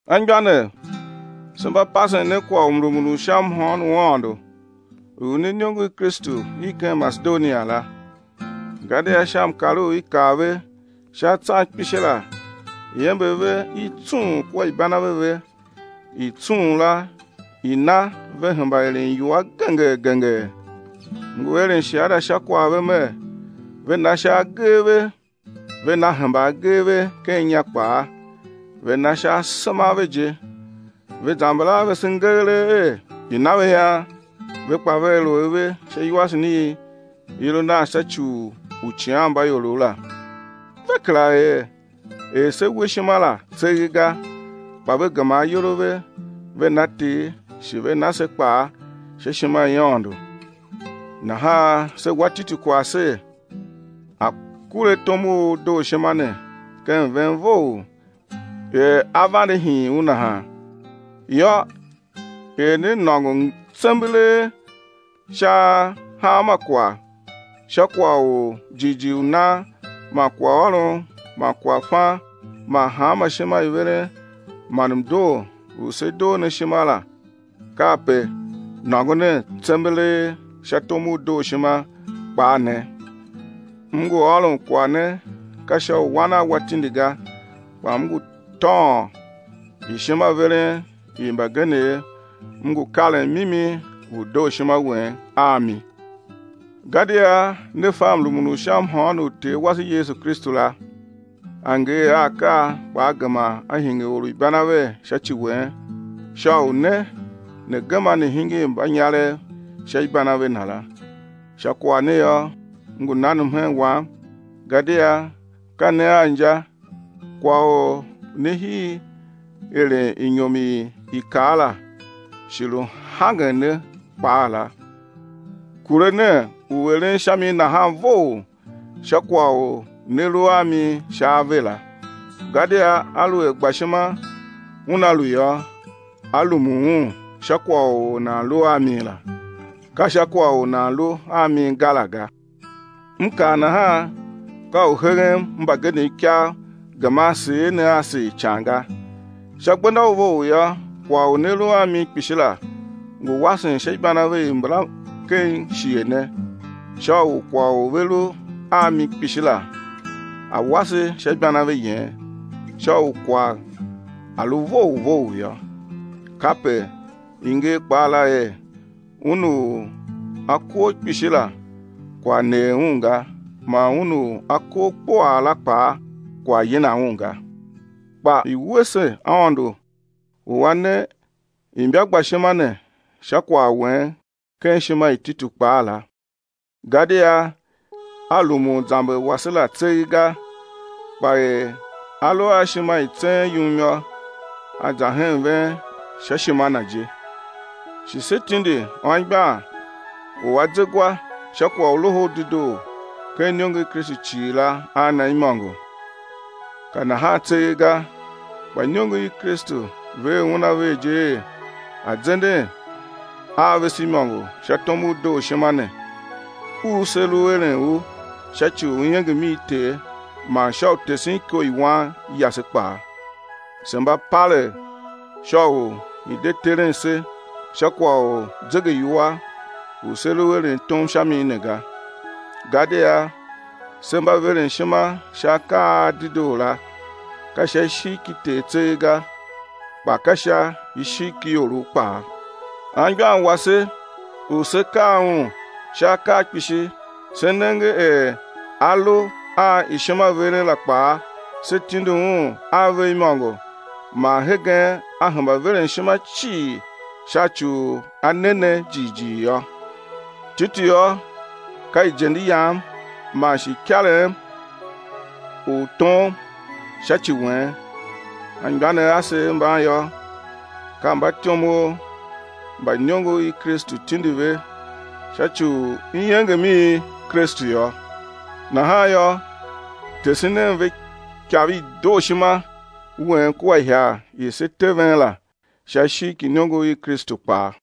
Anmgbianev, se mba pasen ne kwagh u mrumun u sha mhôôn u Aôndo u i ne iniongo i Kristu i ken Masedonia la, gadia sha mkar u i kar ve sha atsan kpishi la iember ve i tsung kua ibanave ve i tsung la i na ve hemba eren iwua gengee gengee. M ngu eren shiada sha kwagh ve mer, ve na sha agee ve, ve na hemba agee ve ken inya kpaa, ve na sha asema a ve je, ve zamber a vese ngeelee er i̱ na ve ian, ve kpaa vea lu ave sha iwasen i i lu nan sha ci u uicighanmbaiorov la. Ve kera er er se we ishima la tseegh ga, kpa ve gema ayol a ve ve na Ter shi ve na se kpaa sha ishima i Aôndo. Nahan se wa Titu kwagh ser, a̱ kure tom u dooshima ne ken ven vough er a vande hiin u nahan. Yô er ne nôngo tsembelee sha hanma kwagh, sha kwagh u jighjigh u nan man kwaghôron man kwaghfan man hanma ishima i veren man mdoo u se doo ne ishima la, kape nôngo nen tsembelee sha tom u dooshima kpaa ne. M ngu ôron kwagh ne ka sha u wan a wa tindi ga, kpa m ngu tôôn ishimaveren i mbagenev m ngu karen mimi u dooshima wen a mi. Gadia ne fa mrumun u sha mhôôn u Ter wase Yesu Kristu la. A ngee a akaa kpa A gema A hingir or u ibanave sha ci wen, sha u ne ne̱ gema ne̱ hingir mbanyarev sha ibanave Na la. Sha kwagh ne yô m ngu nan mhen wam gadia ka ne a inja; kwagh u ne hii eren inyom i i kar la shi lu hangen ne kpaa la, kure nen u eren sha mi nahan vough, sha kwagh u ne lu a mi sha ave la. Gadia aluer gbashima una lu yô, á rumun un sha kwagh u or nan lu a mi la, ka sha kwagh u nan lu a mi ga la ga. M kaa nahan ka u heghem mbagenev ikav geman seer ne a seer ican ga. Sha gbenda u vough yô, kwagh u ne lu a mi kpishi la ngu wasen sha ibanave i mbala ken shighe ne, sha u kwagh u ve lu a mi kpishi la a̱ wase sha ibanave yen, sha u kwagh a̱ lu vough vough yô. Kape i nger kpaa la er, Un u a kor kpishi la kwagh neer un ga man un u a kor kpuaa la kpaa kwagh yina un ga. Kpa i̱ wuese Aôndo u A ne ne imbagbashima ne sha kwagh wen ken ishima i Titu kpaa la, gadia a rumun zamber wase la tseegh ga, kpa er a lu a ishima i tseen yum yô, a za hen ven sha ishima na je. Shi se tindi anmgbian u a ze gwa sha kwagh u Loho u Dedoo ken iniongo i Kristu cii la a na imôngo. Ka nahan tseegh ga, kpa iniongo i Kristu ver un a ver je er a̱ zenden a vese imôngo sha tom u dooshima ne u se lu eren u sha ci u iengem i Ter man sha u tesen iko i wan yase kpaa. Se mba palegh sha u i̱ de teren se sha kwagh u zegeiwua u se lu eren tom sha mi ne ga. Gadia se mba veren ishima sha akaa a dedoo la, ka sha ishigh ki Ter tseegh ga, kpa ka sha ishigh ki iorov kpaa. Anmgbian wase u se kar un sha akaa kpishi se nenge er a lu a ishimaveren la kpaa, se tindi un a ve imôngo man hegen a hemba veren ishima cii sha ci u a ne ne jighjigh yô. Titu yô, ka ijende yam man shi ikarem u tom sha ci wen, anmgbianev asev mban yô, ka mbatyomov mba iniongo i Kristu tindi ve sha ci u iengem i Kristu yô. Nahan yô tese nen ve ikav i dooshima wen kua ihagh i se te ven la sha ishigh ki iniongo i Kristu kpaa.